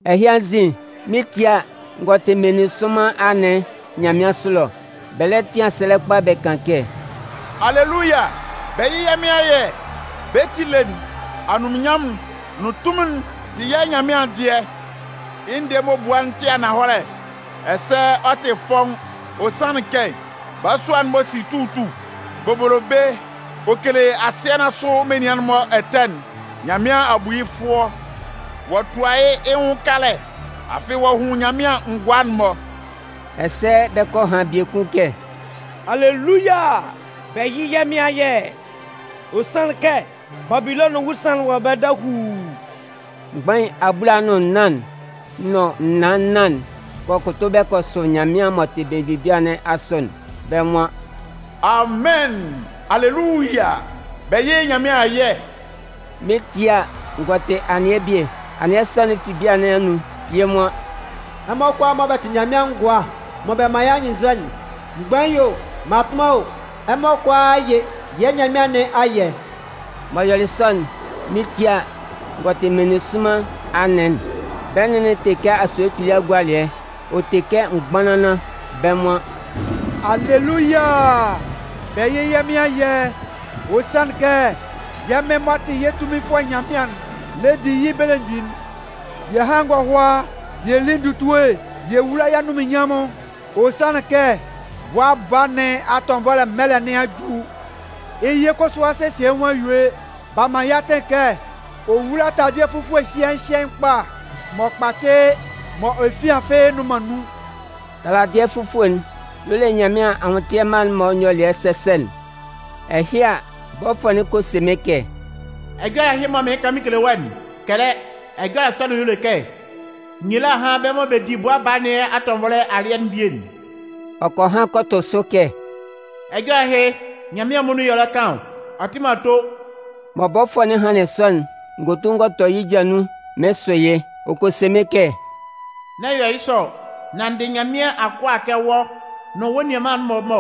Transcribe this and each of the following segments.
Ɛhɩ anzin, mɩn 'tie a, n gɔ tɩ meninsʋnman anɩn nyanmɩansʋ ɛlɔ. Bɛ lɛ tɩan sɛlɛ kpa bɛ kan kɛ: “Aleluya! Bɛ yɩ́ yɛ́ Mɩn ayɛ! Bɛ́ ti ele'n, anunminnyanmʋn'n nʋn tunmin'n tɩ yɛ́ Nyanmɩan'n dɩɛ. Yɩ́ ndɛɛ'n m'ɔ bua'n tɩ ananhɔlɛ, ɛsɛ ɔ tɩ fɔ́ʋ́n. Ɔ sanlɩn kɛ balasua'n m'ɔ si tutu bobolobe ɔ kele asɩɛ nɩn asʋ menian'n-mɔ ɛtɛ'n, Nyanmɩan a bu yɩ́ fʋɔ. Ɔ'a tua yɩ́ yɩ́ nwʋn kalɛ, afɩ ɔ'a hun Nyanmɩan ngʋa'n-mɔ.” Ɛsɛ bɛ kɔ han biekun kɛ: “Aleluya! Bɛ yɩ́ yɛ́ Mɩn ayɛ! Ɔ sanlɩn kɛ Babilɔnʋn ewusanlan'n wɔ ɛbɛlɛ dahuu.” Mgbain abulaa nʋn nnan'n nʋn naan nnan'n kɔ kʋtʋ bɛ kɔ sʋ Nyanmɩan m'ɔ tɩ belemgbin bia nɩn asʋ'n. Bɛ́ nwan: “Amɩn! Aleluya! Bɛ yɩ́ Nyanmɩan ayɛ!” Mɩn 'tie a, n gɔ tɩ anɩɛ bie. Anɩɛ sɔ'n fɩ bia nɩn anun, yɩ́ nwan: “Ɛmɔ kʋalaa mɔ bɛ tɩ Nyanmɩan ngʋa mɔ bɛ man yɩ́ anyɩnnzɔ'n, mgbain o, mmatʋnman o, ɛmɔ kʋalaa yɩ́ yɛ́ Nyanmɩan nɩn ayɛ!” M'ɔ yɔlɩ sɔ'n, mɩn 'tie a, n gɔ tɩ meninsʋnman anɩn'n. Bɛ́ nɩn'n te kɛ asue kpili agualɩɛ, ɔ te kɛ mgbanlanlan. Bɛ́ nwan: “Aleluya! Bɛ yɩ́ yɛ́ Mɩn ayɛ! Ɔ sanlɩn kɛ yɛ́ Mɩn m'ɔ tɩ yɛ́ Tunminfʋɛ Nyanmɩan'n le di yɩ́ belemgbin'n. Yɛ hán ngɔhʋa yɛ lí ndutue yɛ wúla yɩ́ anunminnyanmʋn. Ɔ sanlɩn kɛ Bʋa Baa nɩn atɔnvɔlɛ mɛlɛ nɩn a ju. Yɩ́ yɩ kʋsʋ a sesie yɩ́ nwʋn a yue. B'a man yɩ́ yɩ atɩn kɛ ɔ wúla taladɩɛ fufue hyɩɛɩn hyɩɛɩn kpa m'ɔ kpacɩ mɔ efian fɩ́ɩ́ nnʋn man nun.” (Taladɩɛ fufue'n y'ɔ le Nyanmɩan anwʋntɩɛ mma'n-mɔ nyɔlɩɛ sɛsɛ'n.) Ɛhɩ a, bɔfʋɛ'n kɔ se mɩ́n kɛ: “Ɛjɔlɛ ɛhɩ mɔ mɩɩn kan mɩn kele wɔ́'n, kɛlɛ. Ɛjɔlɛ sɔ'n y'ɔ le kɛ: ‘Nyila hán bɛ́ mɔ bɛ 'di Bʋa Baa nɩn atɔnvɔlɛ alɩɛ'n bie'n!’” Ɔ kɔ han kɔ tʋ sʋ kɛ: “Ɛjɔlɛ ɛhɩ, Nyanmɩan muonun y'ɔ lɛ kan ɔ, ɔ tɩ man ato.” Mɔ bɔfʋɛ'n hanlɩn sɔ'n, n gɔ tu n gɔ tɔ yɩ́ ja nun mɩɩn sʋ yɩ́. Ɔ kɔ se mɩ́n kɛ: “N'ɛ yɔ yɩ́ sɔ! Nán n dɩ Nyanmɩan akʋa kɛ wɔ́ nʋn wɔ́ nianman'n-mɔ mɔ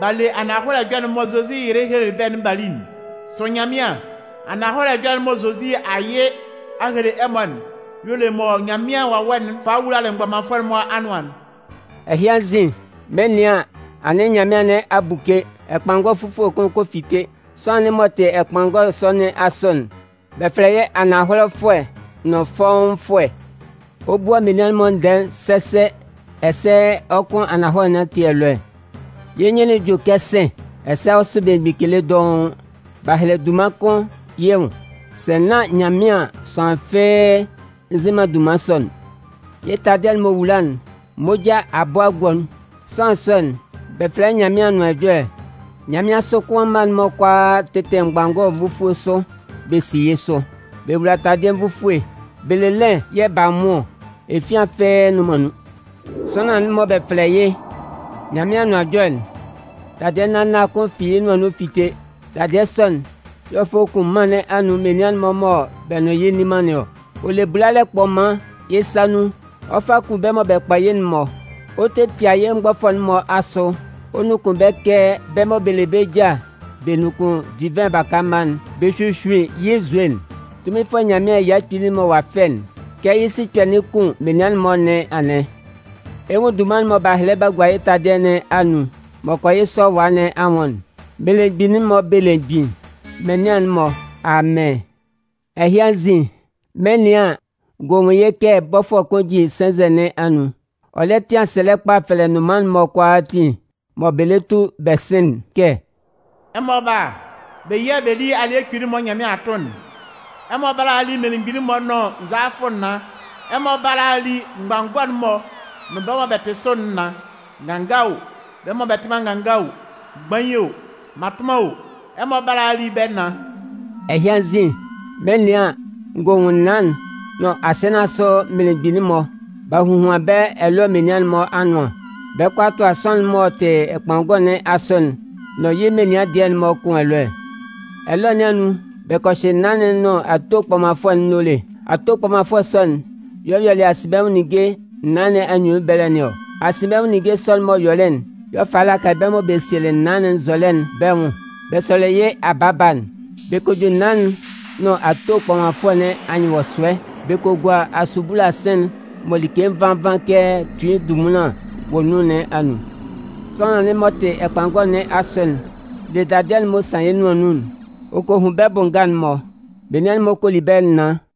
b'a le ananhɔlɛ ɛjɔlɛ'n mɔ Zozi yɩlɩ hele bɛ́'n b'a li'n. Sʋ Nyanmɩan! Ananhɔlɛ ɛjɔlɛ'n mɔ Zozi a yɩ a hele ɛmɔ'n y'ɔ le mɔ Nyanmɩan Wawɛ'n falɩ wulalɩ mgbɔmanfʋɛ'n-mɔ anʋan'n.” Ɛhɩ anzin, mɩn 'nɩan an, anɩn nyanmɩan nɩn a buke, ɛkpanngɔ fufue kʋn kɔ fite. Sʋanlan'n m'ɔ tɩ ɛkpanngɔ sɔ nɩn asʋ'n, bɛ fɛlɛ yɩ́ “Ananhɔlɛfʋɛ nʋn Fɔ́ʋ́nfʋɛ”. Ɔ bua menian'n-mɔ ndɛɛ'n sɛsɛ ɛsɛ ɔ kʋn ananhɔlɛ nɩn ati ɛlɔɛ. Yɩ́ nyɩn'n jue kɛ sɩ̂n, ɛsɛ ɔ sʋ belemgbin kele dɔʋn. B'a hɛlɛ dunman kʋn yɩ́ nwʋn. Sɛ nán yɩ́ ngʋnmɩan an, sʋanlan fɩ́ɩ́ nzɩ man dunman sɔ'n. Yɩ́ taladɩɛ'n m'ɔ wula'n, moja a bɔ a gua nun. Sʋanlan sɔ'n, bɛ fɛlɛ yɩ́ “Nyanmɩan Anʋan Ɛjɔlɛ”. Nyanmɩansʋ kʋan mma'n-mɔ kʋalaa tɩtɩ mgbanngɔ nvufue sʋ bɛ si yɩ́ sʋ. Bɛ wowula ndaladɩɛ nvufue, bɛ le lɩn yɛ̂ b'a nwʋn ɔ, efian fɩ́ɩ́ nnʋn man nun. Sʋanlan'n mɔ bɛ fɛlɛ yɩ́ “Nyanmɩan Anʋan Ɛjɔlɛ'n”, dadɩɛ nâ nâ kʋn fi yɩ́ nʋan nun fite. Dadɩɛ sɔ'n yɛ̂ ɔ 'fa kun mân nɩn anun menian'n-mɔ mɔ bɛ nʋn yɩ́ nni man nɩn ɔ. Ɔ le bulalɛ kpɔman yɩ́ sa nun ɔ 'fa kun bɛ́ mɔ bɛ kpɔ yɩ́'n-mɔ. Ɔ 'tetia yɩ́ mgbɔfʋɛ'n-mɔ asʋ ɔ nunkun bɛ́ kɛ bɛ́ mɔ bɛ le bɛ́ ja bɛ nunkun divɩn baka mma'n bɛ hyuhyuin yɩ́ nzue'n. Tunminfʋɛ Nyanmɩan ɛya kpili'n mɔ ɔ a fɛ'n, kɛ yɩ́ sikpɛ'n 'kun menian'n-mɔ nɩn anɩn. Ɛ 'nwun dunman'n mɔ b'a hɛlɛ b'a gua yɩ́ taladɩɛ nɩn anun, m'ɔ kɔ yɩ́ sɔlɔwa nɩn anwʋn'n: “Melemgbin'n-mɔ Belemgbin, Mɩnlɩan'n-mɔ Amɩn.” Ɛhɩ anzin, mɩn 'nɩan an, n gɔ nwun yɩ́ kɛ bɔfʋɛ kʋn jin sɛnzɛ nɩn anun. Ɔ lɛ tɩan sɛlɛ kpa fɛlɛ nnʋnman'n-mɔ kʋalaatin mɔ bɛ lɛ tu bɛ sɩn'n kɛ: “Ɛmɔ bála, bɛ yía bɛ lí alɩɛ kpili'n mɔ Nyanmɩan a tʋn'n. Ɛmɔ bála a li mmelemgbin'n-mɔ nʋn nzalafʋ naan. Ɛmɔ bála a li mgbanngɔ'n-mɔ nʋn bɛ́ mɔ bɛ tɩ sʋ'n naan. Nganga o, bɛ́ mɔ bɛ tɩ man nganga o, mgbain o mmatʋnman o, ɛmɔ bála a li bɛ́ naan.” Ɛhɩ anzin, mɩn 'nɩan an, n gɔ nwun naan'n nʋn asɩɛ nɩn asʋ mmelemgbin'n-mɔ. B'a hohuan bɛ́ ɛlɔɛ menian'n-mɔ anʋan, bɛ 'kɔ a tʋa sʋanlan'n m'ɔ tɩ ɛkpanngɔ nɩn asʋ'n nʋn yɩ́ menian dɩɛ'n-mɔ kʋn ɛlɔɛ. Ɛlɔɛ nɩn anun, bɛ kɔ hyɩ naan'n nʋn ato kpɔmanfʋɛ'n nóle. Ato kpɔmanfʋɛ sɔ'n y'ɔ yɔlɩ asinbɛnwʋn ninnge naan nɩn anyunnun ɛbɛlɛ nɩn ɔ. Asinbɛnwʋn ninnge sɔ'n-mɔ m'ɔ yɔlɩ'n y'ɔ falɩ lakalɩ bɛ́ mɔ bɛ sielɩ naan'n nzɔlɛ'n bɛ́ nwʋn bɛ sʋlɩ yɩ́ abaaba'n. Bɛ kɔ ju naan'n nʋn ato kpɔmanfʋɛ nɩn anyɩnwɔsʋɛ bɛ kɔ gua asubula sɩ̂n'n mɔ like nvan nvan kɛ tui ndunmunlan wɔ nun nɩn anun. Sʋanlan'n m'ɔ tɩ ɛkpanngɔ nɩn asʋ'n le dadɩɛ'n m'ɔ san yɩ́ nʋan nun'n ɔ kɔ hun bɛ́ bʋ nga'n-mɔ. Nnʋnman'n-mɔ kɔ li bɛ́ naan.